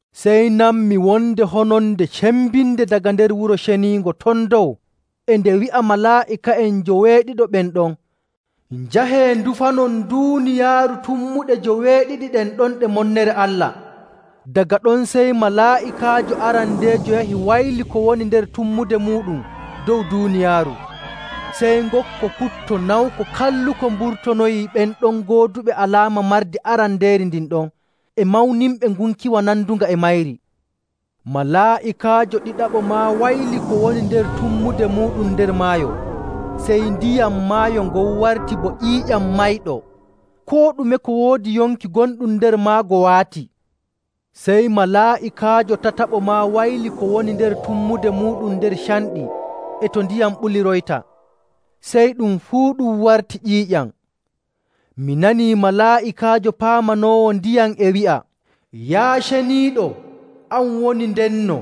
Sey nanmi wonde hononde cembinde daga nder wuro ceniingo ton dow e nde wi'a malaa'ika'en njoweeɗiɗo ɓen ɗon, “Njahee ndufanon duuniyaaru tummuɗe joweeɗiɗi ɗen ɗon ɗe monnere Allah!” Daga ɗon sey malaa'ikaajo arandeejo yahi wayli ko woni nder tummude muuɗum dow duuniyaaru. Sey ngokko putto nawko kalluko mburtonoyii ɓen ɗon gooduɓe alaama mardi arandeeri ndin ɗon e mawninɓe ngunkiwa nandunga e mayri. Malaa'ikaajo ɗiɗaɓo maa wayli ko woni nder tummude muuɗum nder maayo. Sey ndiyam maayo ngon warti bo ƴiiƴam mayɗo. Koo ɗume ko woodi yonki gonɗum nder maago waati. Sey malaa'ikaajo tataɓo maa wayli ko woni nder tummude muuɗum nder canɗi e to ndiyam ɓuliroyta. Sey ɗum fuu ɗum warti ƴiiƴam. Mi nanii malaa'ikaajo paamanoowo ndiyam e wi'a, “Yaa Ceniiɗo, an woni ndenno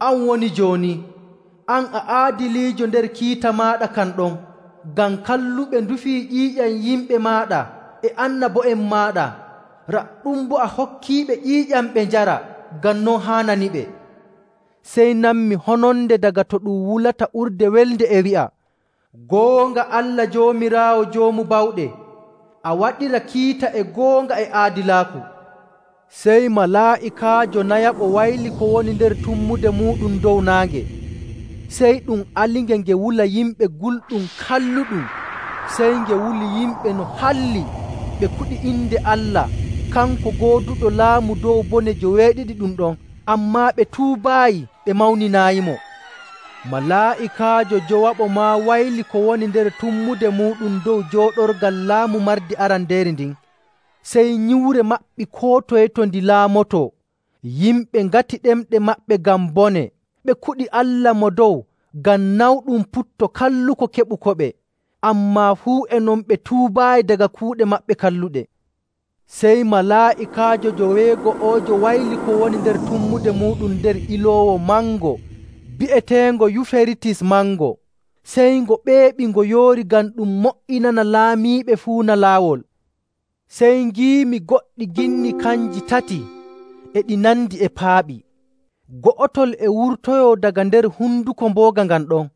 an woni jooni. An a aadiliijo nder kiita maaɗa kan ɗon. Ngam kalluɓe ndufii ƴiiƴam yimɓe maaɗa e annabo'en maaɗa, raɗɗum boo a hokkiiɓe ƴiiƴam ɓe njara ngam non haananiɓe.” Sey nanmi hononde daga to ɗum wulata urde welnde e wi'a, “Goonga, Allah Joomiraawo Joomu Bawɗe! A waɗira kiita e goonga e aadilaaku!” Sey malaa'ikaajo nayaɓo wayli ko woni nder tummude muuɗum dow naange. Sey ɗum alinge nge wula yimɓe gulɗum kalluɗum. Sey nge wuli yimɓe no halli, ɓe kuɗi inde Allah, kanko gooduɗo laamu dow bone joweeɗiɗi ɗum ɗon. Ammaa ɓe tuubaayi ɓe mawninaayimo. Malaa'ikaajo njowaɓo maa wayli ko woni nder tummude muuɗum dow jooɗorgal laamu mardi arandeeri ndin, sey nyiwre maɓɓi koo toye to ndi laamotoo. Yimɓe ŋati ɗemɗe maɓɓe ngam bone, ɓe kuɗi Allah Mo Dow ngam nawɗum putto kalluko keɓukoɓe. Ammaa fuu e non ɓe tuubaayi daga kuuɗe maɓɓe kalluɗe. Sey malaa'ikaajo joweego'oojo wayli ko woni nder tummude muuɗum nder iloowo mango bi'eteengo Yuferitis mango. Sey ngo ɓeeɓi ngo yoori ngam ɗum mo''inana laamiiɓe fuuna laawol. Sey ngiimi goɗɗi ginni kanji tati e ɗi nandi e paaɓi, go'otol e wurtoyoo daga nder honduko mbooga ngan ɗon,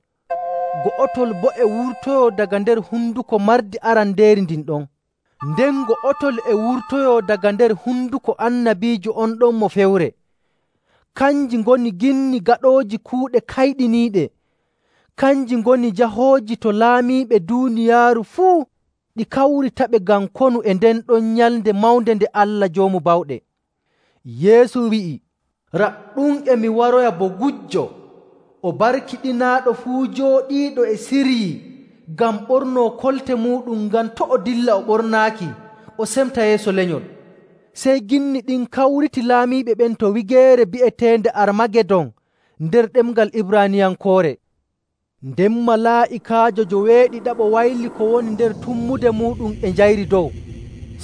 go'otol boo e wurtoyoo daga nder honduko mardi arandeeri ndin ɗon, nden go'otol e wurtoyoo daga nder honduko annabiijo on ɗon mo fewre. Kanji ngoni ginni gaɗooji kuuɗe kayɗiniiɗe. Kanji ngoni jahooji to laamiiɓe duuniyaaru fuu ɗi kawritaɓe ngam konu e nden ɗon nyalnde mawnde nde Allah Joomu Bawɗe. Yeesu wi'i, “Raɗɗum e mi waroya bo gujjo! O barkiɗinaaɗo fuu jooɗiiɗo e siryii ngam ɓornoo kolte muuɗum ngam to' o dilla o ɓornaaki o semta yeeso lenyol.” Sey ginni ɗin kawriti laamiiɓe ɓen to wigeere bi'eteende Armagedon nder ɗemngal Ibraaniyankoore. Nden malaa'ikaajo njoweeɗiɗaɓo wayli ko woni nder tummude muuɗum e njayri dow.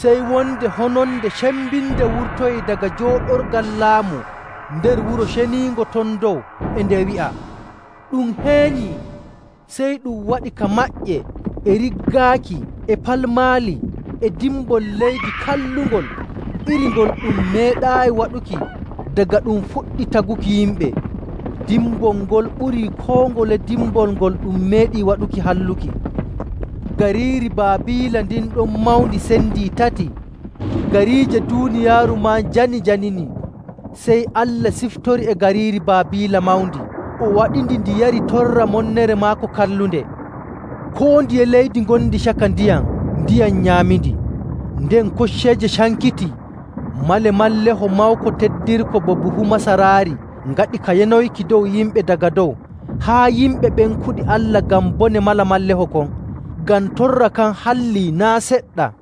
Sey wonde hononde cembinde wurtoyii daga jooɗorgal laamu nder wuro ceniingo ton dow e nde wi'a, “Ɗum heenyii!” Sey ɗum waɗi ka maƴƴe e riggaaki e palmaali e dimbol leydi kallungol iri ngol ɗum meeɗaayi waɗuki daga ɗum fuɗɗi taguki yimɓe. Dimbol ngol ɓurii koo ngole dimbol ngol ɗum meeɗi waɗuki halluki. Gariiri Baabiila ndin ɗon mawndi sendii tati, gariije duuniyaaru maa njani njanini. Sey Allah siftori e gariiri Baabiila mawndi, o waɗindi ndi yari torra monnere maako kallunde. Koo ndiye leydi ngondi caka ndiyam ndiyam nyaamindi, nden kocceeje cankitii. Malemalleeho mawko teddirko bo buhu masaraari ngaɗi ka yanoyki dow yimɓe daga dow haa yimɓe ɓen kuɗi Allah ngam bone malemalleho kon, ngam torra kan hallii naa' seɗɗa!